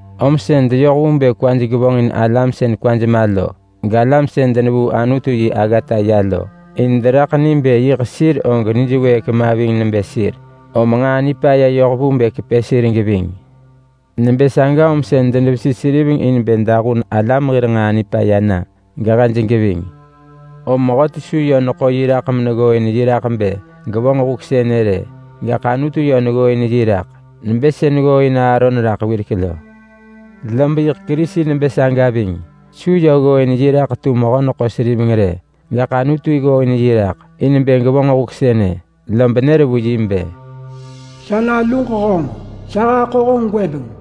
Om sën deyoh vu bë kwaj gevonġin alam sën kwaj ma lo, galam sën denevuu Anutu yi aggata ya lo. In deraḳ ni bë yiḳ sir og nij wëëk ma ving nebë sir, om nġaa nipaya yoh vu bë kepë sir geving. Nebë saga om sën denevesi seriveng in bë dahun alam hir nġaa nipaya na, gehej geving. Om mehöti su yö neḳo yi raḳ meneggooin yi raḳ bë gevonġ huk sënë rë. Gaḳ Anutu yö neggooin yi raḳ nebë sën ggooin Aaron raḳ wirek lo. Lob yiḳ Kerisi nebë saga ving. Su yö ggooin yi raḳ tu mehö-neḳo-seriveng rë, gaḳ Anutu ggooin yi raḳ in bë gevonġ huk sënë, lob nër vu yi bë: “Sa naluġ honġ. Sa haḳo honġ gwëbeng.”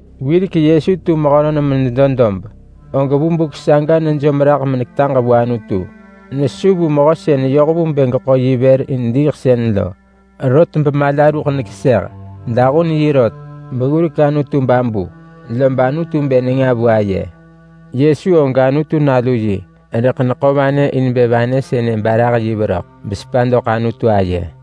Wirek Yesu tu mehönon menedo dob, og vu buk saga nejom raḳ meneketaġ vu Anutu. Nesu vu Mehö sën yoh vu bë geḳo yi vër in diiḳsën lo, rot bemala ruḳ nekeseh. Dahun yi rot beggurek Anutu babu, lob Anutu bë nenga vu aye. Yesu og Anutu Nalu yi, rëḳ neḳo vanë in bë vanë sënë barah yi veröḳ besepa doḳ Anutu aye.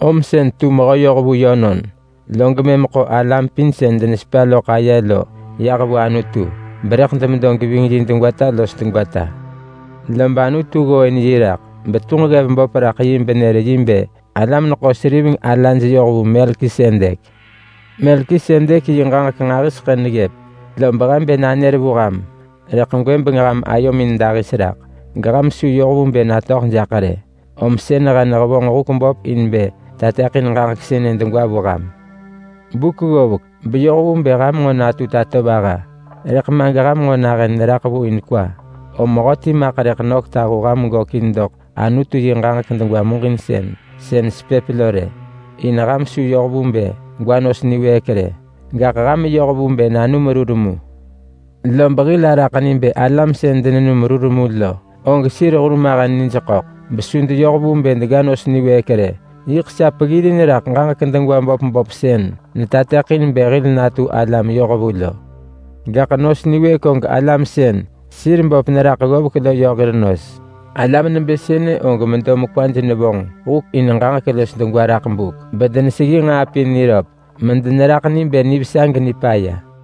Om sën tu mehö yohvu yönon, log mëm ḳo alam pin sën denesepa loḳ aye lo yah vu Anutu berëḳ demedo geving yi degwata los degwata. Lob Anutu ggooin yi raḳ betunġ ggev böp raḳ yi benër yi bë alam-neḳo-seriveng alaj yoh vu Melkisedek. Melkisedek yi ġaġek nġahiseḳë neggëp, lob he bë nanër vu ham, rëḳ gwëbeng ham ayomin dahis raḳ gesu ham yoh vu bë natöḳ jaḳ rë. Om sën he nehevonġ huk böp in bë tateḳin ġaġek sënë degwa vu ham. Buk ggovek beyoh vu bë ham natu tatovaha, rëḳ ma geham nahën neraḳ vu in kwa. Om mehöti maḳ rëḳ nök tahu ham gökin doḳ Anutu yi ġaġek degwa muġinsën sën sepëp lo rë. In ham su yoh vu bë gwa nos niwëëk rë, gaḳ ham yoh vu bë nanum rur mu. Lob hil araḳ ni bë alam sën denenum rur mu lo, og sir hurmahen nij ḳöḳ besu deyoh vu bë dega nos niwëëk rë. Yiḳ sa peggirin raḳ ġaġek degwa böp böp sën netateḳin bë hil natu alam yohvu lo. Gaḳ nos niwëëk og alam sën sir böp neraḳ ggovek lo yö hir nos. Alam nebë sënë og medo mekwaj nevonġ huk in ġaġek los degwa raḳ buk bedeneseggi nġaa pin niröp medeneraḳ ni bë nivesa genipaya.